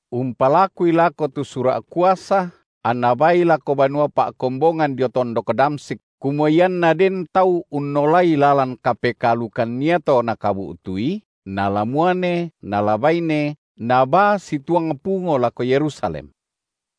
umpalakui lako tu sura’ kuasa anna baai lako banua pa’kombongan dio tondok Damsyik, kumua ianna den tau unnolai lalan kapekaalukan iato nakabu’tui, nala muane nala baine, nabaa situang pungo lako Yerusalem.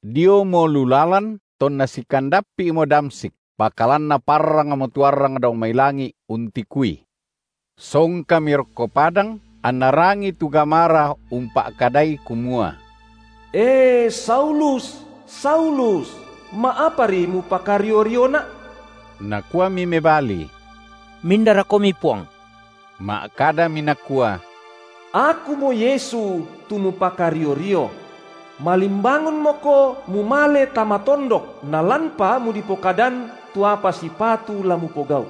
Diomo lu lalan, tonna sikandappi’mo Damsyik, pakalan naparrangmo tu arrang dao mai langi’ untikui; Songkami rokko padang, anna rangii tu gamara umpa’kadai kumua: E Saulus, Saulus, ma’apari mupakario-rioNa’? Nakuami mebali: MindaroKomi, Puang? Ma’kadami nakua: Akumo Yesu, tu mupakario-rio. Malimbangunmoko mumale tama tondok, nalanpa mudipokadan tu apa sipatu la mupogau’.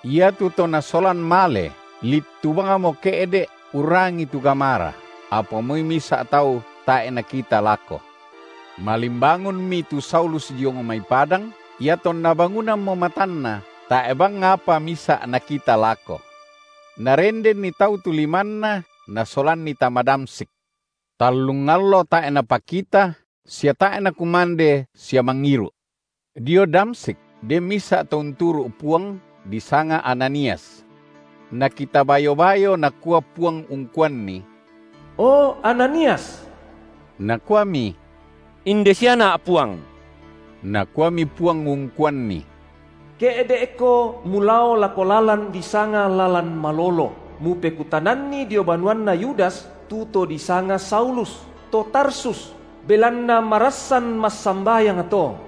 Iatu to nasolan male littu bangmo ke’de’ urrangii tu gamara, apa moi misa’ tau tae’ nakita lako. Malimbangunmi tu Saulus diong mai padang: Iatonna bangunammo matanna, tae’ bang apa misa’ nakita lako. Narendenni tau tu limanna nasolanni tama Damsyik. Tallung allo tae’ napakita, sia tae’ nakumande sia mangiru’. Dio Damsyik den misa’ to unturu’ Puang, di sanga Ananias. Nakita bayo-bayo Nakua Puang ungkuanni: O Ananias! Nakuami: Inde siana’, Puang. Nakuami Puang ungkuanni: Ke’de’ko mulao lako lalan disanga lalan Malolo, mupekutananni dio banuanna Yudas tu to disanga Saulus, to Tarsus, belanna marassan massambayang to,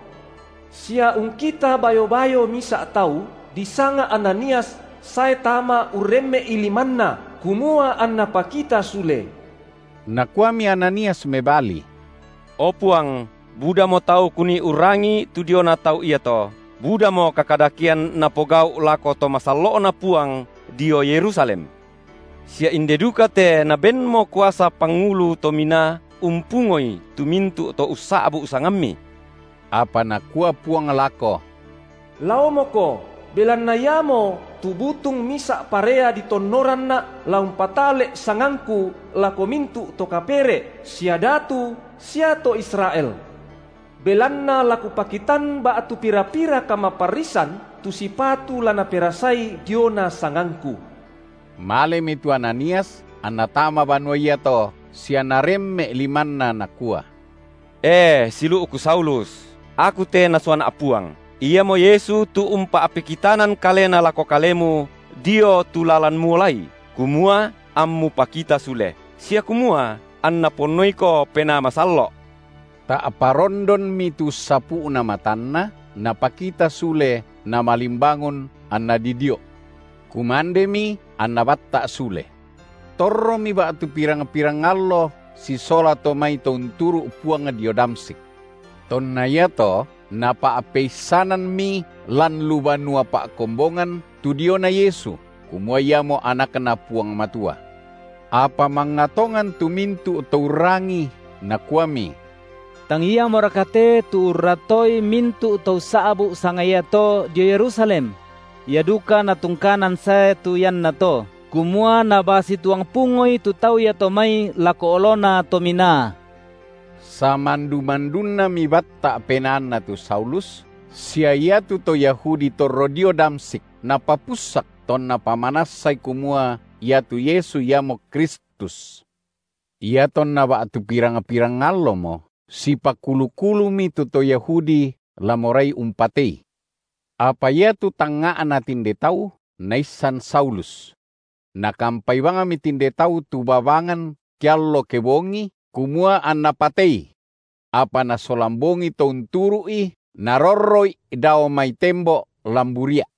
sia ungkita bayo-bayo misa’ tau, disanga Ananias sae tama urremme’i limanna, kumua anna pakita sule. Nakuami Ananias mebali: O Puang budamo tau kunii urrangii tu diona tau iato, budamo kakadakean napogau’ lako to masallo’Na Puang dio Yerusalem. Sia inde duka te nabenmo kuasa pangulu to minaa umpungoi tu mintu’ to ussa’bu sangamMi. Apa Nakua Puang lako: Laomoko, belanna iamotu butung misa’ parea ditonnoranNa’ la umpatale’ sangangKu lako mintu’ to kapere’ sia datu sia to Israel. Belanna la Kupakitan ba’tu pira-pira kamaparrisan tu sipatu la naperasai diona sangangKu. Malemi tu Ananias anna tama banua iato, sia naremme’ limanna nakua: E siulu’ku Saulus, aku te Nasuana’ Puang, iamo Yesu tu umpa’pekitanan Kalena lako kalemu dio tu lalan muolai, kumua ammu pakita sule, sia kumua anNa ponnoiko Penaa Masallo’. Ta’pa rondonmi tu ussapu’na matanna, napakita sule, namalimbangun anna didio’. Kumandemi anna batta’ sule. Torromi ba’tu pirang-pirang allo sisola to mai to unturu’ Puang dio Damsyik. Tonna iato napa’peissanammi lan lu banua pa’kombongan tu diona Yesu kumua Iamo AnakNa Puang Matua. Apa mangnga tongan tu mintu’ to urrangii nakuami: Tang iamoraka te tu urratoi mintu’ to ussa’bu’ sanga iato dio Yerusalem! ia duka natungkanan sae tu iannato, kumua nabaa situang pungoi tu tau iato mai lako olona to minaa. Samandu-mandunnami batta’ penaanna tu Saulus sia iatu to Yahudi torro dio Damsyik napapussak tonna pamanassai kumua iatu Yesu iamo Kristus. Iatonna ba’tu pirang-pirang allomo, sipakulu-kulumi tu to Yahudi la morai umpatei. Apa iatu tangnga’na tinde tau naissan Saulus. Nakampai bangmi tinde tau tu babangan ke allo kebongi, kumua anna patei; apa nasolan bongi to unturu’i narorro’i dao mai tembo’ lan buria’.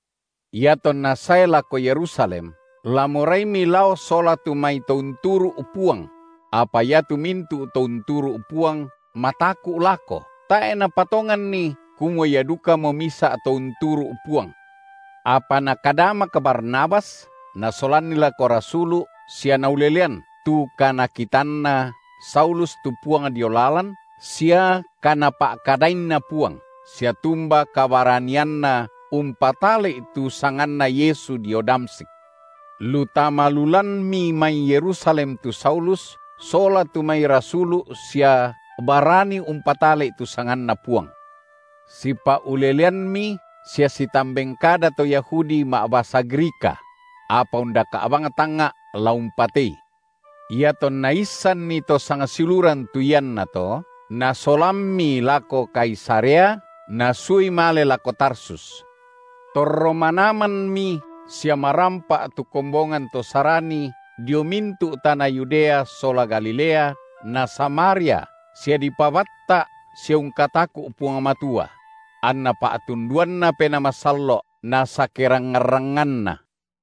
Iatonna sae lako Yerusalem, la moraimi lao sola tu mai to unturu’ Puang; apa iatu mintu’ to unturu’ Puang mataku’ lako, tae’ napatonganni kumua ia dukamo misa’ to unturu’ Puang. Apa nakadamak Barnabas nasolanni lako rasulu’ sia naulelean, tu kanakitanna Saulus tu Puang dio lalan, sia kaNapa’kadainna Puang, sia tumba kabaranianna umpatale’i tu sanganNa Yesu dio Damsyik. Lu tama lu lanmi mai Yerusalem tu Saulus sola tu mai rasulu’ sia barani umpatale’i tu sanganNa Puang. Sipa’uleleanmi sia sitamben kada to Yahudi ma’basa Grika; apa undaka’ bang tangnga’ la umpatei. Iatonna issanni to sangsiuluran tu iannato, nasolammi lako Kaisarea, nasuai male lako Tarsus. Torro manamanmi sia marampa’ tu kombongan to Sarani dio mintu’ tana Yudea sola Galilea na Samaria sia dipabatta’ sia ungkataku’ Puang Matua; anna pa’tunduanNa Penaa Masallo’ nasakerangngan-rangnganna.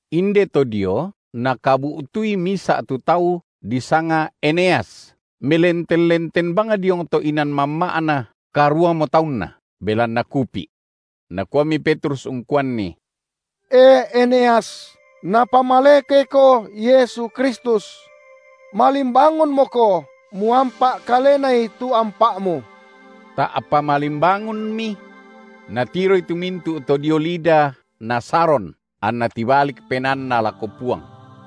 Indeto dio nakabu’tui misa’ tu tau disanga Eneas melenten-lenten bang diong inan mamma’na karuamo taunna, belanna kupi’. Nakuami Petrus ungkuanni: E Eneas, Napamalekeko Yesu Kristus. Malimbangunmoko, muampa’ kalenai tu ampa’mu. Ta’pa malimbangunmi. Natiroi mintu’ to dio Lida na Saron, anna tibalik penaanna lako Puang.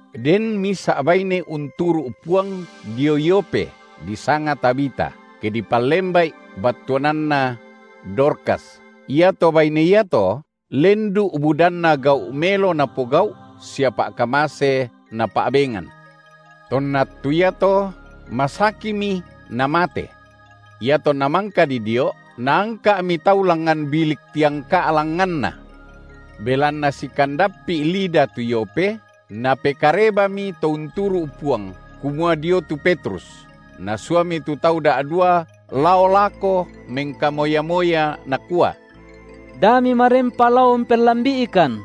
Den misa’ baine unturu’ Puang dio Yope disanga Tabita, ke dipallemba’i, battuananna: Dorkas; iato baine iato lendu’ budanna gau’ melo napogau’ sia pa’kamase napa’bengan. Tonna attu iato masakimi namate. Iatonna mangka didio’, naangka’mi tau langngan bilik tiangka’ langnganna. Belanna sikandappi’ Lida tu Yope napekarebami to unturu’ Puang kumua dio tu Petrus, nasuami tu tau da’dua lao lako mengkamoya-moya nakua: Da mimarempa lao umpellambi’ikan.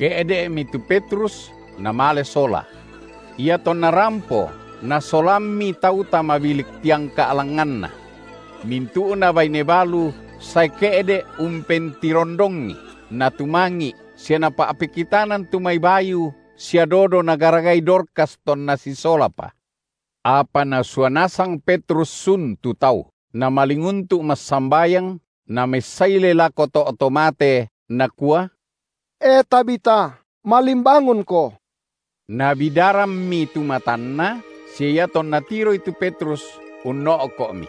Ke’de’mi tu Petrus namale sola. Iatonna rampo nasolammi tau tama bilik tiangka’ langnganna. Mintu’na baine balu sae ke’de’ umpentirondongi, natumangi’ sia napa’pekitanan tu mai bayu sia dodo nagaragai Dorkas tonna sisolapa. Apa na sua nasang Petrus sun tu tau, namalinguntu’ massambayang, namessaile lako to’ to mate, nakua: E Tabita, malimbangunko! Nabidarammi tu matanna, sia iatonna tiroi tu Petrus, unno’ko’mi.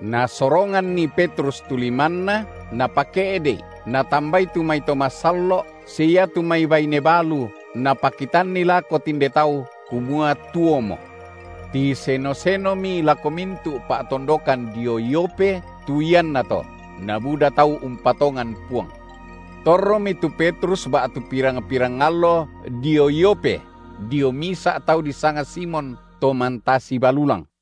Nasoronganni Petrus tu limanna, napake’de’i, natambai tu mai to masallo’ sia iatu mai baine balu, napakitanni lako tinde tau kumua tuomo. Tiseno-senomi lako mintu’ pa’tondokan dio Yope tu iannato, nabuda tau umpatongan Puang. Torromi tu Petrus ba’tu pirang-pirang allo dio Yope dio misa’ tau disanga Simon, to mantasi balulang.